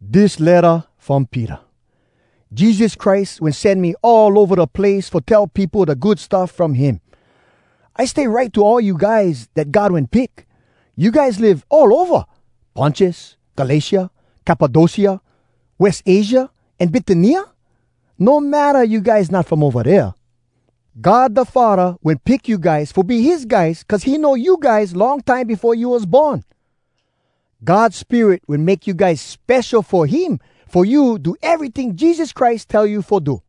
Dis letta from Peter. Jesus Christ wen sen me all ova da place fo tell peopo da Good Stuff from him. I stay write to all you guys dat God wen pick. You guys live all ova Pontus, Galatia, Cappadocia, West Asia, an Bitynia. No matta you guys not from ova dea. God da Faddah wen pick you guys fo be his guys cuz he know you guys long time befo you was born. God Spirit wen make you guys spesho fo him fo you do eryting Jesus Christ tell you fo do.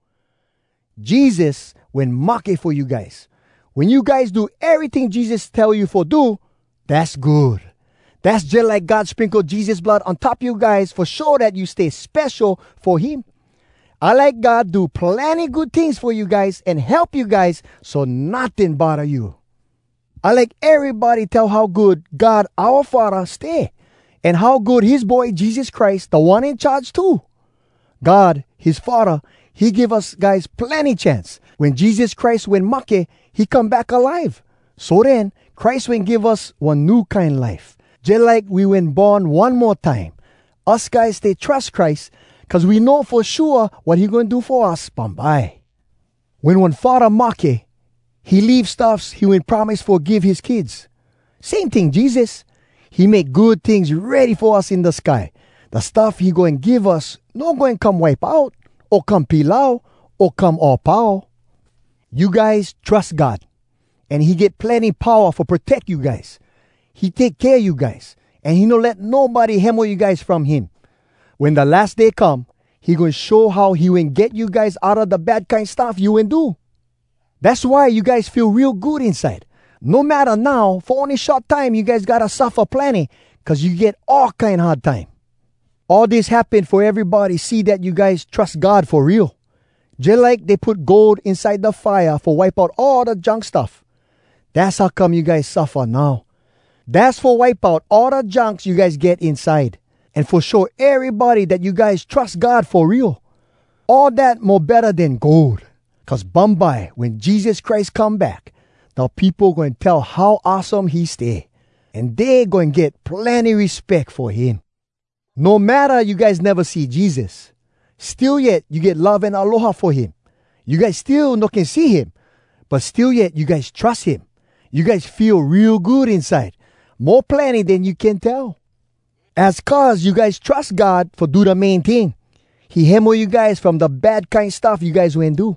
Jesus wen mahke fo you guys! Wen you guys do eryting Jesus tell you fo do, dass good. Dass jalike God sprinkle Jesus blood on top you guys fo show dat you stay spesho fo him. I like God do plenny good tings fo you guys an help you guys so notting bodda you. I like erybody tell how good God oua Faddah stay, an how good his Boy Jesus Christ, Da One In Charge, too. God, his Faddah, he give us guys plenny chance. Wen Jesus Christ wen mahke, he come back alive! So den, Christ wen give us one new kine life, jalike we wen born one mo time. Us guys stay trus Christ cuz we know fo shua wat he goin do fo us bumbye. Wen one faddah mahke, he leave stuffs he wen promise fo give his kids. Same ting Jesus, he make good tings ready fo us in da sky. Da stuff he goin give us no goin come wipe out, o come pilau, o come all pau. You guys trus God, an he get plenny powa fo proteck you guys. He take kea you guys, an he no let nobody hemo you guys from him. Wen da las day come, he goin show how he wen get you guys outa da bad kine stuff you wen do. Dass why you guys feel real good inside. No matta now fo ony short time you guys gotta suffa plenny cuz you get all kine hard time. All dis happen fo erybody see dat you guys trus God fo real. Jalike dey put gold inside da fire fo wipe out all da junk stuff. Dass how come you guys suffa now. Dass fo wipe out all da junks you guys get inside, an fo show erybody dat you guys trus God fo real. All dat mo betta den gold. Cuz bumbye wen Jesus Christ come back, da peopo goin tell how awesome he stay, an dey goin get plenny respeck fo him. No matta you guys neva see Jesus, still yet you get love an aloha fo him. You guys still no can see him, but still yet you guys trus him. You guys feel real good inside, mo plenny den you can tell. Az cuz you guys trus God fo do da main ting: he hemo you guys from da bad kine stuff you guys wen do.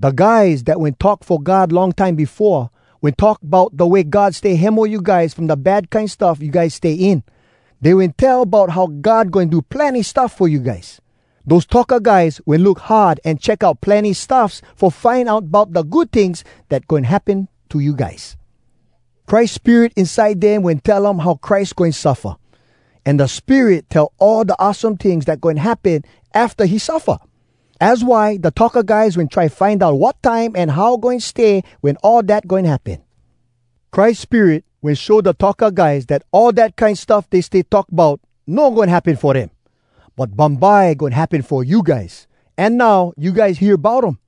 Da guys dat wen talk fo God long time befoa, wen talk bout da way God stay hemo you guys from da bad kine stuff you guys stay in. Dey wen tell bout how God goin do plenny stuff fo you guys. Dose talka guys wen look hard an check out plenny stuffs fo find out bout da good tings dat goin happen to you guys. Christ Spirit inside dem wen tell um how Christ goin suffa. An da Spirit tell all da awesome tings dat goin happen afta he suffa. Az why da talka guys wen try find out wat time an how goin stay wen all dat goin happen. Christ Spirit wen show da talka guys dat all dat kine stuff dey stay talk bout no goin happen fo dem, but bumbye goin happen fo you guys. An now you guys hear bout um.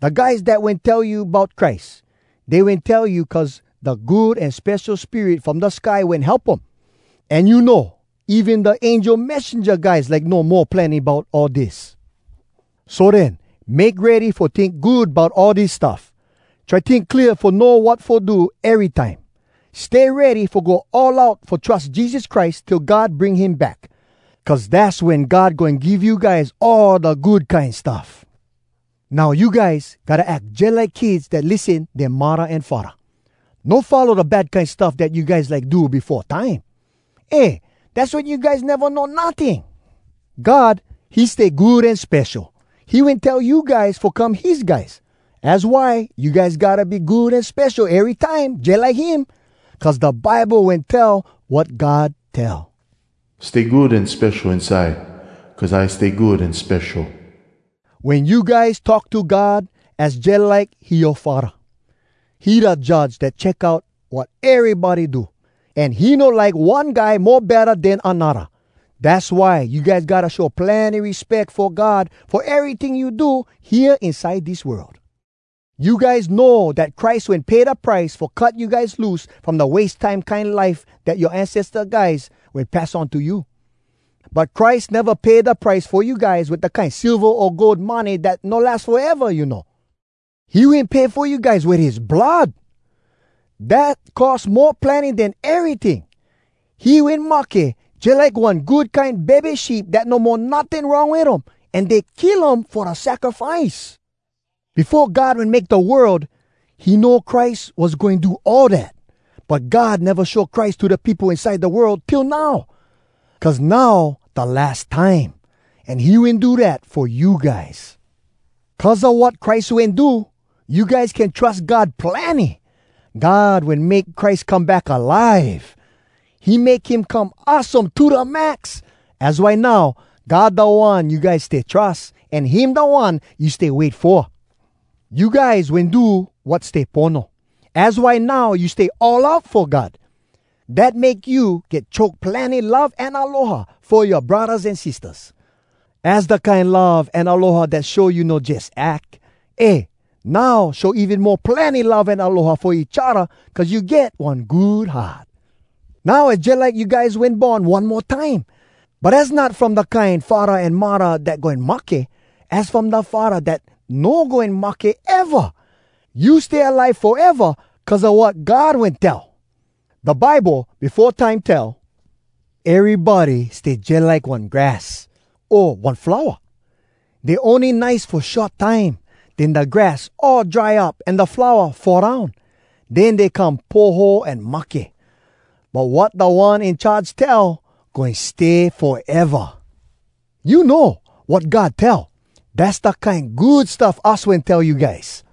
Da guys dat wen tell you bout Christ, dey wen tell you cuz da Good An Spesho Spirit from da sky wen help um. An you know, even da angel messenja guys like know mo plenny bout all dis. So den, make ready fo tink good bout all dis stuff. Try tink clear fo know wat fo do erytime. Stay ready fo go all out fo trus Jesus Christ till God bring him back. Cuz dass wen God goin give you guys all da good kine stuff. Now you guys gotta ack jalike kids dat lissen dea muddah an faddah. No follow da bad kine stuff dat you guys like do befo time. Eh, dass wen you guys neva know notting! God, he stay good an spesho. He wen tell you guys fo come his guys. Az why you guys gotta be good an spesho erytime, jalike him. Cuz da Bible wen tell wat God tell: “Stay good an spesho inside cuz I stay good an spesho.” Wen you guys talk to God az jalike he yoa Faddah. He da Judge dat check out wat erybody do, an he no like one guy mo betta den anodda. Dass why you guys gotta show plenny respeck fo God fo eryting you do hea inside dis world. You guys know dat Christ wen pay da price fo cut you guys loose from da wase time kine life dat yoa ancesta guys wen pass on to you. But Christ neva pay da price fo you guys wit da kine silva o gold money dat no las foeva, you know. He wen pay fo you guys wit his blood! Dat cost mo plenny den eryting! He wen mahke, jalike one good kine bebe sheep dat no mo notting wrong wit um an dey kill um fo da sacrifice. Befo God wen make da world, he know Christ was goin do all dat. But God neva show Christ to da peopo inside da world till now, cuz now da las time. An he wen do dat fo you guys. Cuz a wat Christ wen do, you guys can trus God plenny. God wen make Christ come back alive! He make him come awesome to da max! Az why now, God da One you guys stay trus. An him da One you stay wait fo. You guys wen do wat stay pono, az why now you stay all out fo God. Dat make you get choke plenny love an aloha fo yoa braddahs an sistahs. Az da kine love an aloha dat show you no jus ack. Eh, now show even mo plenny love an aloha fo each odda cuz you get one good heart. Now az jalike you guys wen born one mo time. But az not from da kine faddah an muddah dat goin mahke. Az from da Faddah dat no goin mahke eva! You stay alive foeva cuz a wat God wen tell! Da Bible befo time tell, “Erybody stay jalike one grass, o one flowa. Dey ony nice fo short time. Den da grass all dry up An da flowa fall down. Den dey come poho an mahke, But wat Da One In Charge tell, Goin stay foeva.” You know, wat God tell, dass da kine Good Stuff us wen tell you guys.